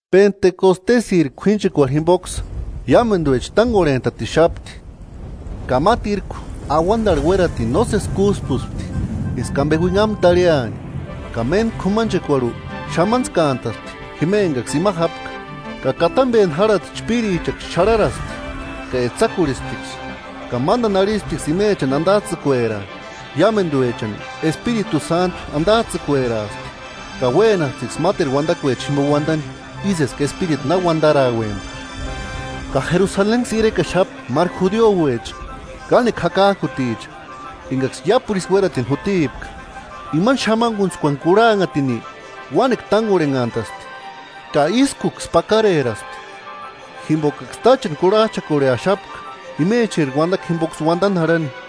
Penteskostesïri k'uínchekurhu jimpoksï iámentuecha tánkorhent'atixapti. Ka mátirku auantarhu uératini nósesi kúspuspti, eska ampe uinhamu tarhiani, ka méntku k'umanchekuarhu xamantskantaspti jima enkaksï ima jápka. Ka katampeni járhati chpíririksï xarharaspti ka etsakurhisptiksï, ka mántani arhisptiksï imechani antats'ïkueraani. Iámentuechani Espiritu Sántu antats'ïkueraaspti, ka uénasptiksï máteru uantakuechani jimpo uántani, ísï eska Espiritu na uantarauempka. Ka Jerusalenksï irekaxapti máru judiuecha, kánekua jakak'uticha enkaksï iápuru ísï uératini jútipka. Imani xamankuntskuani kurhanhatini uánekua tánkorhenhantaspti, ka ískuksï pakareraspti, jimpokaksï táchani kurhach'akorheaxapka imecheri uantakua jimpoksï uantani jarhani.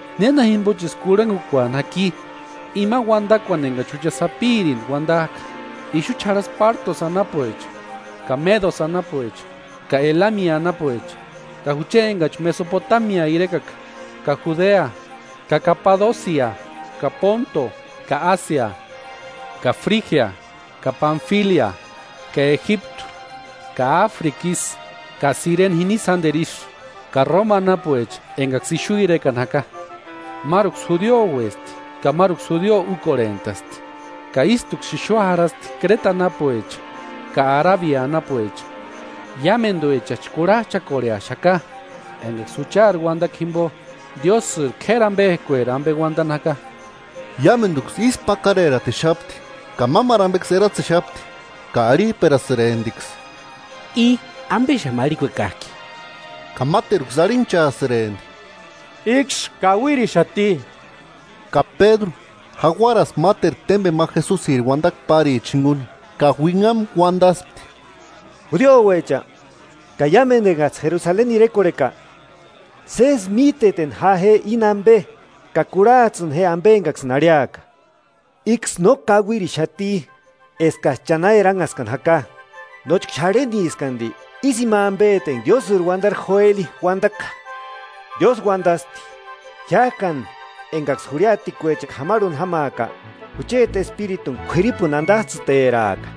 ¿Néna jimpochisï kurhankukuani jaki imani uantakuani enkachi jucha sapirintki uantak'a? Ixuchi jarhaska Pártosï anapuecha ka Médosï anapuecha ka Elami anapuecha, ka jucha enkachi Mesopotamia irekaka; ka Judea ka Kapadosia ka Pónto ka Ásia, ka Frígia ka Panfilia ka Ejiptu ka Áfrika ísï, ka Sirene jini sánteru ísï, ka Róma anapuecha enkaksï ixu irekani jaka; máruksï judiouesti ka máruksï judio úkorhent'asti. Ka ístuksï ixu jarhasti Kréta anapuecha ka Arabia anapuecha, iámentuechachi kurhach'akorheaxaka enkaksï juchari uantakua jimpo, Diósïri k'éri ampekueri ampe uantani jaka. Iámentuksï ísku pakareratixapti ka mámaru ampeksï eratsexapti ka arhip'erasïremptiksï: –¿I ampexamu arhikuekak'i? Ka máteruksï arhinhchaasïrempti: –Íksï kauirixati. Ka Pédru, jauaraspti máteru témpeni ma Jesusiri uantakua párichani jinkuni ka uinhamu uantaspti: “Judiouecha, ka iámentu enkats'ï Jerusaleni irekorheka: Sési mítetini ja je íni ampe, ka kurhats'ïni je ampe enkaksïni arhiaka. Íksï no kauirixati eskats'ï cha na eranhaskani jaka, nóchka xarheniski anti. Ísï ima ampeti enka Diósïri uantari Joeli uantaka: Diósï uantasti: Jiák'ani enkaksï jurhiatekuecha k'amarhuni jámaaka, jucheti Espirituni k'uiripuni antats'ïteraaka,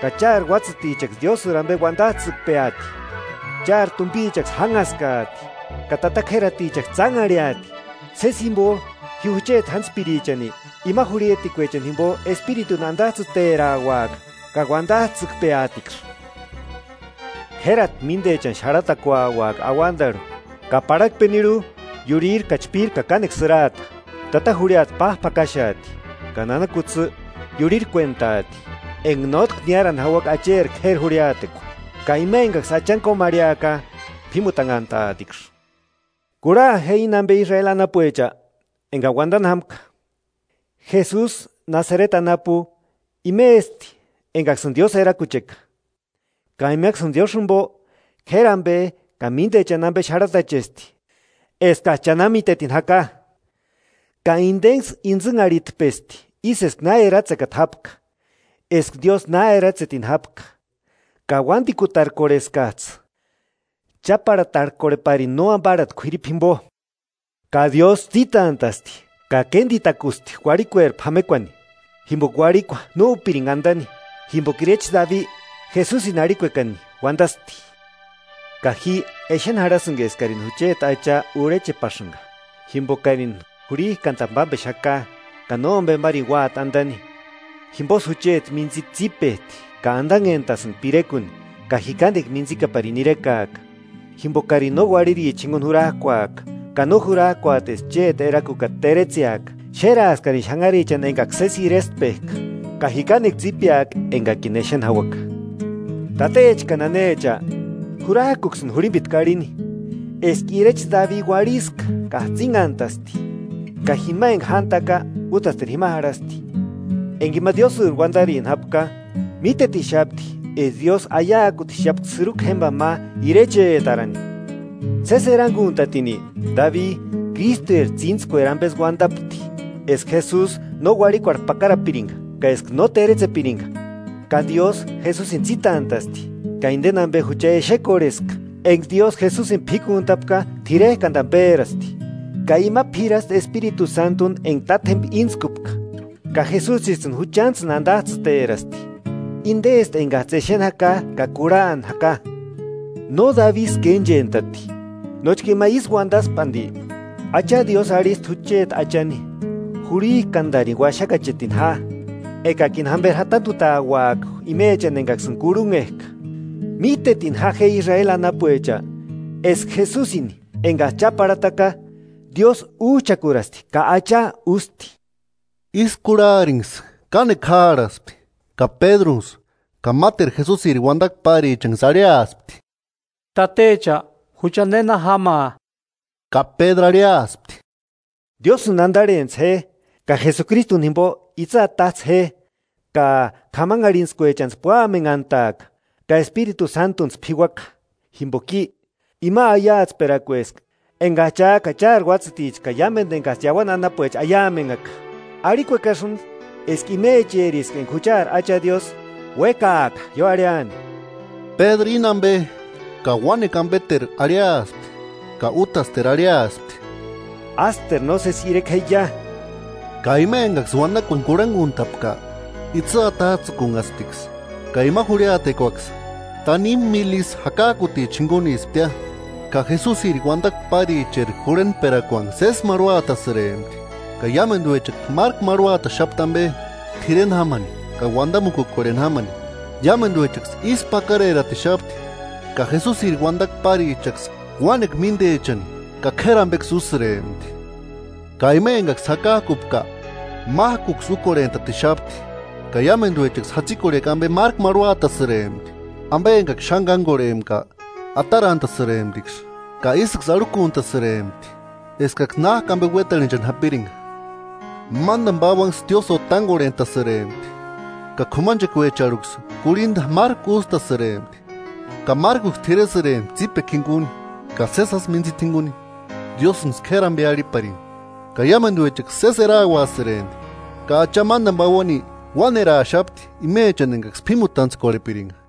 ka chári uátsïtichaksï Diósïri ampe uantats'ïkpeaati; chári tumpichaksï jánhaskaati, ka tata k'ératichaksï tsánharhiati; sési jimpo ji jucheti jántspirichani, ima jurhiatekuechani jimpo Espirituni antats'ïterauaka ka uantats'ïkup'eatiksï. K'érati míntechani xarhatauaka auantarhu, ka parhakpeni iurhiri ka chpíri ka kánekua sïraata. Tata jurhiata páp'akaxeati, ka nana kutsï iurhirkuentaati, enka nótki niárani jauaka Acheri k'éri jurhiatekua. Ka ima enkaksï Achani kómarhiaka, p'ímutanhantaatiksï. Kurha je íni ampe Israeli anapuecha, enkani uantani jámka: Jesusi Nasareti anapu imesti, enkaksïni Diósï erakucheka, ka imaksïni Diósïni jimpo, k'éri ampe, ka míntechani ampe xarhatachesti eskats'ï cha na mítetini jaka; ka intenksï intsïnharhitpesti ísï eska na eratsekata jápka, eska Diósï na eratsetini jápka; ka uántikutarkorheskats'ï cháparhatarkorheparini nóamparhati k'uiripu jimpo. Ka Diósï tsítant'a'sti, ka kéntitakusti uarhikueri p'amekuani, jimpoka uarhikua no úpirinka antani. Jimpoka irecha Dabi, Jesusini arhikuekani uantasti: Ji exeni jarhasïnka eskarini jucheti Acha urhechepasïnka, jimpokarini jurhik'antani pámpexaka, ka nómpemarini úati antani. Jimposï jucheti mintsita tsípet'i, ka antanhentasïnka pirekuni, ka ji kánekua mintsikaparini irekaaka, jimpokari no uarhiricha jinkuni jurak'uaka, ka no jurak'uati eska chéti erakukata teretseaka. Xéraaskarini xanharichani enka sési irestpek'a, ka ji kánekua tsípeaka enkakini exeni jauaka.” “Tatecha ka nanecha, jurak'uksïni jurhimpitku arhini, eska irecha Dabi uarhiska ka jatsinhantasti, ka jima enka jántaka, útasteru jima jarhasti. Enka ima Diósïri uantarini jápka, mítetixapti eska Diósï aiakutixapka sïrukua jémpani ma irechetarani, sési erankuntatini, Dabi, Krístueri tsíntskueri ampesï uantapti, eska Jesusi no uarhikuarhu pakarapirinka ka eska no téretsepirinka. Ka Diósï Jesusini tsítant'a'sti, ka inteni ampe jucha exekorheska. Enka Diósï Jesusini p'íkuntapka, t'irek'antani pérasti, ka ima p'irasti Espiritu Sántuni enka Tátjempa íntskupka ka Jesusits'ïni juchantsïni antats'ïterasti, intesti enkats'ï exeni jaka ka kurhani jaka. No Dabisï kénchent'ati, nóchka ima ísï uantaspki anti: Acha Diósï arhisti jucheti Achani, jurhik'antarini uaxakachetini ja, ekakini jamperi jatantutauaka imechani enkaksïni kurhunhek'a.” “Mítetini jaueksï Israeli anapuecha, eska Jesusini enkats'ï cháparhataka, Diósï úch'akurasti ka Acha ústi.” Ísï kurharinksï kánekua jáarhaspti ka Pédrunksï ka máteru Jesusiri uantakua párichanksï arhiaspti: –Tatecha, ¿Jucha nena jámaa? Ka Pédru arhiaspti: –Diósïni antarhentsï je ka Jesukristuni jimpo itsï atats'ï je, ka k'amanharhintskuechantsï púamenhant'aaka, ka Espiritu Sántuntsï p'iuaka. Jimpoka i, ima aiatsperakueska enkats'ï cha ka chári uátsïticha ka iámentu enkaksï iauani anapuecha aiamenhaka. Arhikuekasïnti, eska imecheriska enka juchari Acha Diósï uékaaka ioarhiani. Pédru íni ampe ka uánekua ampeteru arhiaspti ka útasteru arhiaspti: –¡Ásteru nósesi ireke jeia! Ka ima enkaksï uantakuani kurhankuntapka, itsï atats'ïkunhasptiksï ka ima jurhiatekuaksï tanimu míli isï jakak'uticha jinkunisptia. Ka Jesusiri uantakua páricheri jurhentperakuanksï sési marhuatasïrempti, ka iámentuechaksï márku marhuataxapti ampe, t'ireni jámani ka uantamukukorheni jámani. Iámentuechaksï ísku pákareratixapti, ka Jesusiri uantakua párichaksï uánekua míntechani ka k'éri ampeksï úsïrempti. Ka ima enkaksï jakak'upka mák'uksï úkorhent'atixapti, ka iámentuechaksï jatsikorhekua ampe márku marhuatasïrempti; ampe enkaksï xáni kánkorhempka, atarantasïremptiksï ka ísïksï arhukuntasïrempti eskaksï nák'u ampe uéntarhinchani jápirinka. Mántani pauanksï tiósïo tánkorhent'asïrempti, ka k'umanchekuarhuecharhuksï kurhinta márku ústasïrempti, ka márkuksï t'iresïrempti tsípekua jinkuni ka sési jásï mintsita jinkuni. Diósïnksï k'éri ampe arhiparini, ka iámentuechaksï sési erauasïrempti. Ka Acha mántani pauani uáneraaxapti imechani enkaksï p'ímutantskorhepirinka.